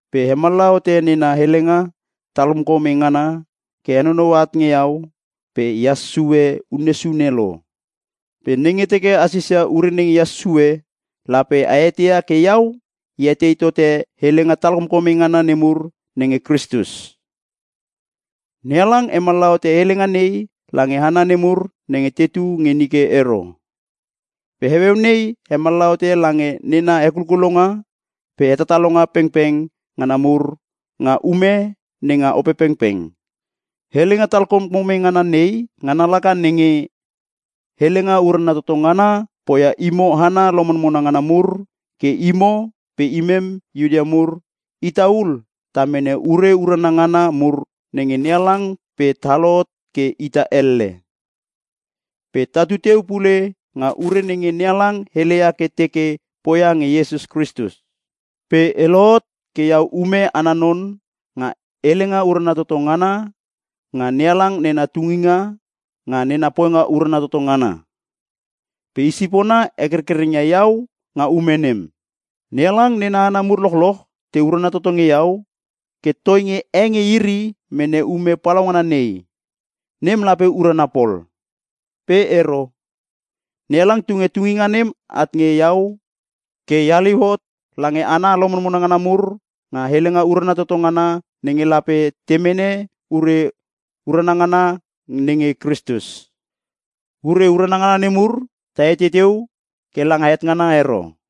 Pe hemallaha hote nena helenga talkomkome ngana ke henonoua at nge iau pe ehas sue unne sune lo. Pe nenge teke a sisia ure nenge ehas sue, lape a eteia ke iau e etei tote helenga talkomkome ngana nemur nenge Kristus. NeHalang hemallaha hote helenga nei lange hana nemur nenge tetu nge nike ero. Pe heueu nei hemallaha hote lange nena hekulkulonga pe hetatalonga pengpeng ngana mur nga ume nenga Opepengpeng. Helenga talkomkome ngana nei ngana laka nenge: Helenga urana toto ngana poia imo hana lomonmona ngana mur ke imo pe imem Iuta mur, ita ul ta mene ure urana ngana mur nge NeHalang pe ta lohot ke ita elle. Pe tatu teu pule nga ure nenge NeHalang heleia ke teke poia nge Iesus Kristus. Pe e lohot ke iau ume ana non nga helenga urana toto ngana nga NeHalang nena tunginga nga nena poinga urana toto ngana. Pe i sipona hekerkereng ia iau nga ume nem. NeHalang nena hana mur lochloch te urana toto nge iau ke toinge e nge iri mene ume palaungana nei, nem lape urana pol. Pe ero. NeHalang tunge tunginga nem at nge iau ke e haliu hot lange hana lomonmona ngana mur nga helenga urana toto ngana nenge lape te mene ure urana ngana nenge Kristus. Ure urana ngana nemur, ta etei teu ke langa het ngana ero.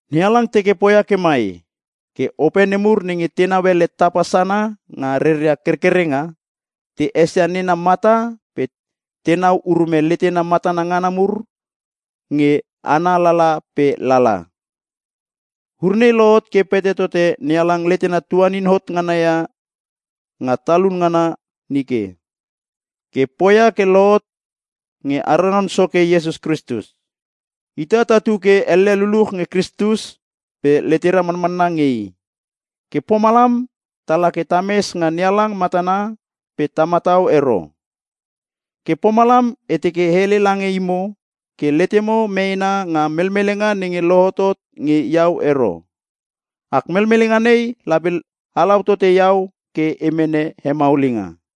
NeHalang teke poia ke mai, ke ope nemur nenge tenau ele tapa sana nga reria kerkerenga, te esia nena mata pe tenau urume letena matana ngana mur nge ana lala pe lala. Ure nei lohot ke pete tote NeHalang letena tuanin hot ngana ia nga talun ngana nike, ke poia ke lohot nge ara Non Soke Iesus Kristus. Ita tatu ke elle luluch nge Kristus pe letera manmanna nge i. Ke pomalam tala ke tames nga NeHalang matana pe ta matau ero. Ke pomalam e teke e hele lange imo ke letemo meena nga melmelenga nenge lohotot nge iau ero. Ak melmelenga nei lape halau tote imo ke a mene hemalmalinga.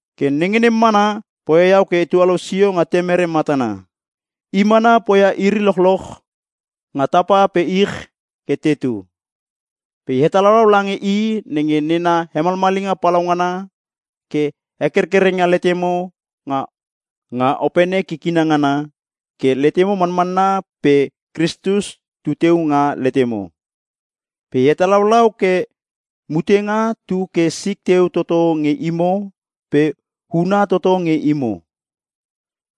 Ke nenge nem mana poia iau ke e tualou sio nga Temere matana. I mana poia iri lochloch nga tapa pe ich ke tetu. Pe e hetalaulau lange i nenge nena hemalmalinga palaungana ke hekerkereng ia letemo nga Opene kikina ngana, ke letemo manmanna pe Kristus tuteu nga letemo. Pe e hatalaulau ke mutenga tu ke sik teu toto nge imo pe huna toto nge imo.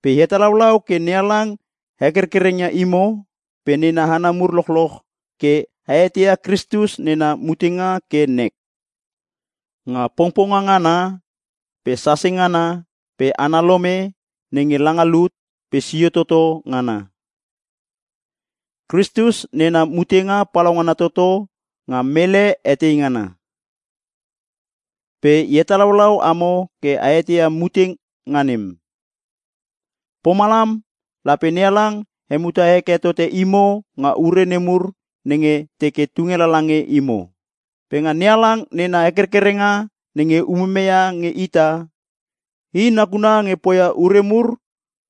Pe e hetalaulau ke NeHalang hekerkereng ia imo pe nena hana mur lochloch ke a eteia Kristus nena mutenga ke nek. Nga pongponga ngana pe sase ngana pe ana lome nenge langa lut pe sio toto ngana. Kristus nena mutenga palaungana toto nga mele etei ngana. Pe e hatalaulau amo ke a eteia mutenga nem, pomalam lape NeHalang hemuta heke tote imo nga ure nemur nenge teke tunge lange imo. Pe nga NeHalang nena kerkerenga nenge umume nge ita, i nakuna nge poia ure mur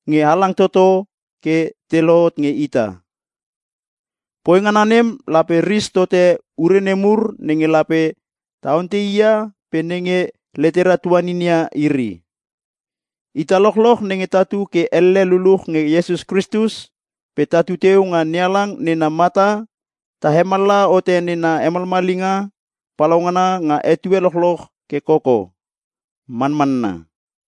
nge halang toto ke te lohot nge ita. Poi ngana nem lape ris tote ure nemur nenge lape ta ontei i ia pe nenge letera tuaninin ia iri. Ita lochloch nenge tatu ke elle luluch nge Iesus Kristus pe tatu teu nga NeHalang nena mata ta hemallaha hote nena hemalmalinga palaungana nga etue lochloch ke koko. Manmanna.